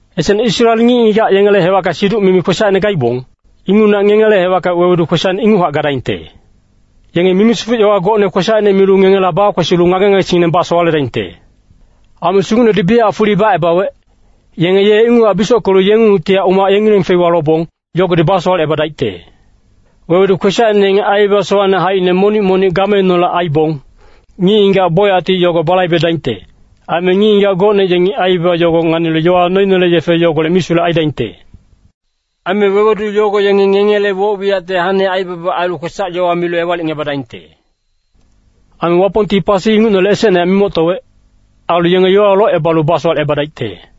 Esecne Israel ngic-ngigac yengele hewacka siduc-mimi ngic kwesacine gaibong, ingucnehac ngengele hewacka wewedu kwesacine inguchac gadaingte. Yenge mimi-sifuc yowa gocne kwesacine milu ngengela bakwesilu ngage-ngagesingngineng basowaledaingte. Aime Sugucnedi biyachac fuli bacebawec, yenge ye inguchac bisockelu yengungtihac umac yengileng feiwa lobong, yogodi basowalecebadaicte. Wewedu kwesacine yenge aibaba sowacne haicine monic-monic gameineholec aibong, ngic-ngigac bocyacti yogo balaibedaingte. Aime ngic-ngigac gocne yengi aibaba yogo nganilu yowa noinele yefe yogolec misulec aidaingte. Aime wewedu yogo yenge ngengele woc-wiyacte hane aibaba ailu kwesac-yowa milu ewalicngebadaingte. Aime Wapongti pasi ingucnele esecnehac mimoctowec. Ailu yenge yowawa locebalu basowalecebadaicte.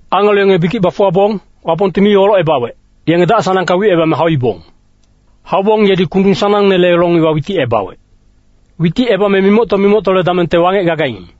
Angelo yenge bikic bafuwabong, Wapongti mi olocebawec, yenge dac-sanangka wicebame hauibong. Haubong yedi kundung sanangnele long iwa witicebawec. Witicebame mimocto-mimoctole damengte wangec gagaing.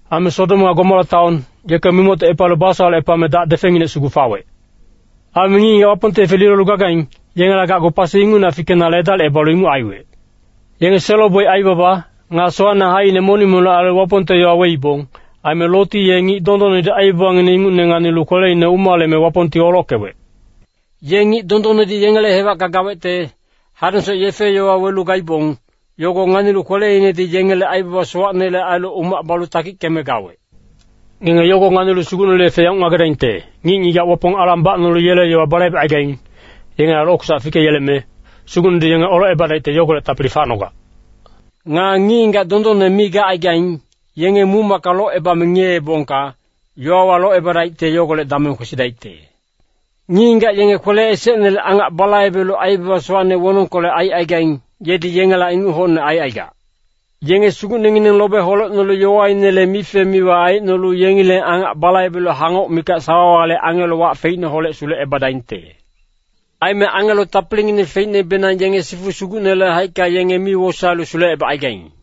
Aime Sodom nga Gomora taon, yeke mimoctocepalu basowalecepame dac defenginec sugu fawec. Aime ngic-ngigac Wapongte yefe lilolu gagaing, yengela gacgu pasi ingucnehac fikenale edalicebalu inguc aiwec. Yenge selo-boic aibaba, nga sowacne haicine monic-monic ailu Wapongte yowa weibong. Aime Loti ye ngic dondonnedi aibabangineng ingucne nganilu kweleine umaleme Wapongti olockewec. Ye ngic dondonnedi yengele hewacka gawecte, hadengsoc yefe-yowa welu gaibong, yogo nganilu kweleinedi yengele aibaba sowacnele ailu umac balu takickeme gawec. Ngenge yogo nganilu Sugucnele yefe yanguc ngagedaingte, ngic-ngigac Wapong alang bacnolu yele yowa balaibecaigaing, yengela lokwesac fikeyeleme, Sugucnedi yenge olocebadaicte yogolec tapili facnogac. Nga ngic-ngigac dondonne mi gacaigaing, yenge muc-macka locebame ngiyeebongka, yowawa locebadaicte yogolec dameng kwesidaicte. Ngic-ngigac yenge kwele esecnele angac balaibelu aibaba sowacne wonongkolec aicaigaing, yedi yengela inguc hocne aicaigac. Yenge sugucnengineng lobe holecnolu yowainele mife-miwa aicnolu yengileng angac balaibelu hangoc mikac sawawale angelo wac feicneholec sulecebadaingte. Aime angelo tapilingineng feicnebenang yenge sifu Sugucnele haicka yenge mi wosaelu sulecebacaigaing.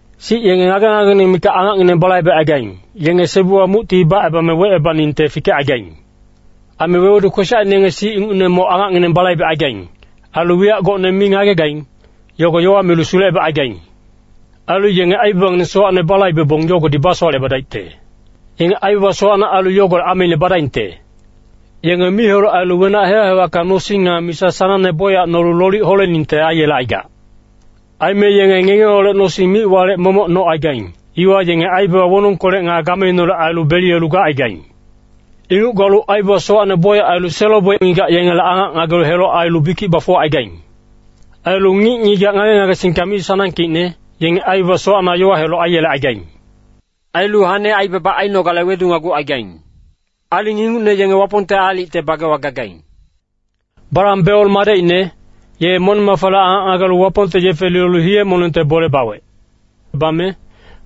Sic yenge ngage-ngagengineng mikac angacngineng balaibecaigaing, yenge sebuwa mucti bacebame wecebaningte fikecaigaing. Aime wewedu kwesacine yenge sic ingucne moc angacngineng balaibecaigaing. Ailu wiyac gocne mi ngagegaing, yogo yowa milu sulecebacaigaing. Ailu yenge aibabangineng sowacne balaibebong yogodi basowalecebadaicte. Yenge aibaba sowacne ailu yogolec ameine badaingte. Yenge mic-heloc ailu wenac hewac-hewacka nosing nga misa sanangne bocyac nolu lolic holeningte aiyelecaigac. Aime yenge ngengeholec nosing mic-walec momoc nocaigaing, iwa yenge aibaba wonongkolec nga gameineholec ailu beliyelu gacaigaing. Inguc galu aibaba sowacne bocyac ailu selo-boic ngigac yengele angac ngagelu heloc ailu bikic bafuwacaigaing. Ailu ngic-ngigac ngage-ngagesingka mi sanangkeicne, yenge aibaba sowacna yowa heloc aiyelecaigaing. Ailu hane aibaba ainogale wedunagucaigaing. Aling ingucne yenge Wapongte aalicte bagewa gagaing. Balam Beor madecine, ye moneng-mafale angac ngagelu Wapongte yefe lilolu hiye-monengte bole bawec. Bame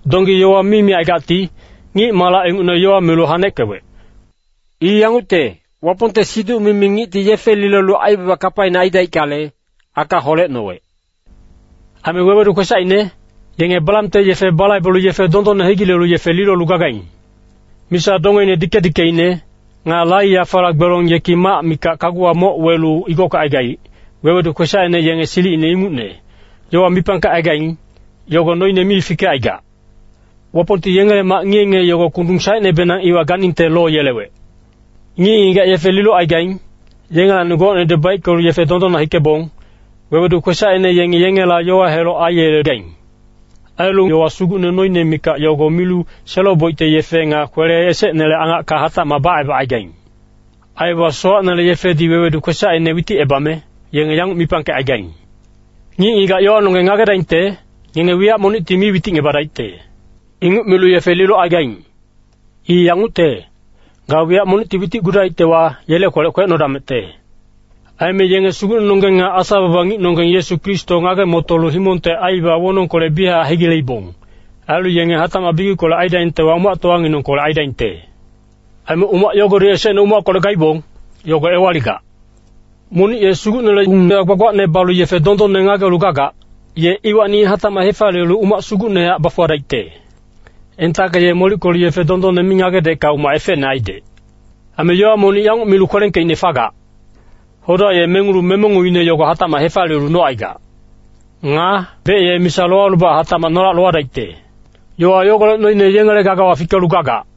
donggi yowa mi micaigacti, ngic-malac ingucne yowa milu haneckewec. I yangucte, Wapongte siduc-mimi ngicti yefe lilolu aibaba kapaine aidaickale, aka holecnowec. Aime wewedu kwesacine, yenge Balamte yefe balaibelu yefe dondonne hegilelu yefe lilolu gagaing. Misa dongeine dike-dikeine, nga lai-yafala gbelong yeki mac mikac kaguwa moc welu igockecaigaic, wewedu kwesacine yenge silicine ingucne, yowa mipangkecaigaing, yogo noine mi fikecaigac. Wapongti yengele mac ngiye-ngiye yogo kundung saecnebenang iwa ganingte loyelewec. Ngic-ngigac yefe lilocaigaing, yengelacni gocnedi baickelu yefe dondonna hikebong, wewedu kwesacine yengi yengela yowa heloc aiyelegaing. Ailu yowa sugucne noine mikac yogo milu selo-boicte yefe nga kwele esecnele angacka hatacmac bacebacaigaing. Aibaba sowacnele yefedi wewedu kwesacine witicebame, yenge yanguc mipangkecaigaing, “Ngic-ngigac yowanonggeng ngagedaingte, ngenge wiyac monicti mi witicngebadaicte.” Inguc milu yefe lilocaigaing. I yangucte, ga wiyac monicti witicgudaictewa, yele kwelec kwecnodamecte. Aime yenge Sugucnenonggeng nga Asa-baba ngicnonggeng Yesu Kristo ngage-motolu himongte aibaba wonongkolec biyachac hegileibong. Ailu yenge hatacmac bikickolec aidaingtewa, umactowanginengkolec aidaingte. Aime umac yogodi esecne umackolec gaibong, yogo ewaligac. Monic ye Sugucnele ung-yowa gbagbacne balu yefe dondonne ngagelu gagac, ye iwacni hatacmac hefaliyelu umac sugucnehac bafuwadaicte. Entacka ye molickelu yefe dondonne mi ngagedecka umac efecne aidec. Aime yowa monic yanguc milu kwelengkeicne fagac, “Hoda ye mengulu memenguine yogo hatacmac hefaliyelu nocaigac.” Nga “Bec ye misa lowalubac hatacmac nolac lowadaicte.” Yowa yogolec noine yengele gagawa fikelu gagac.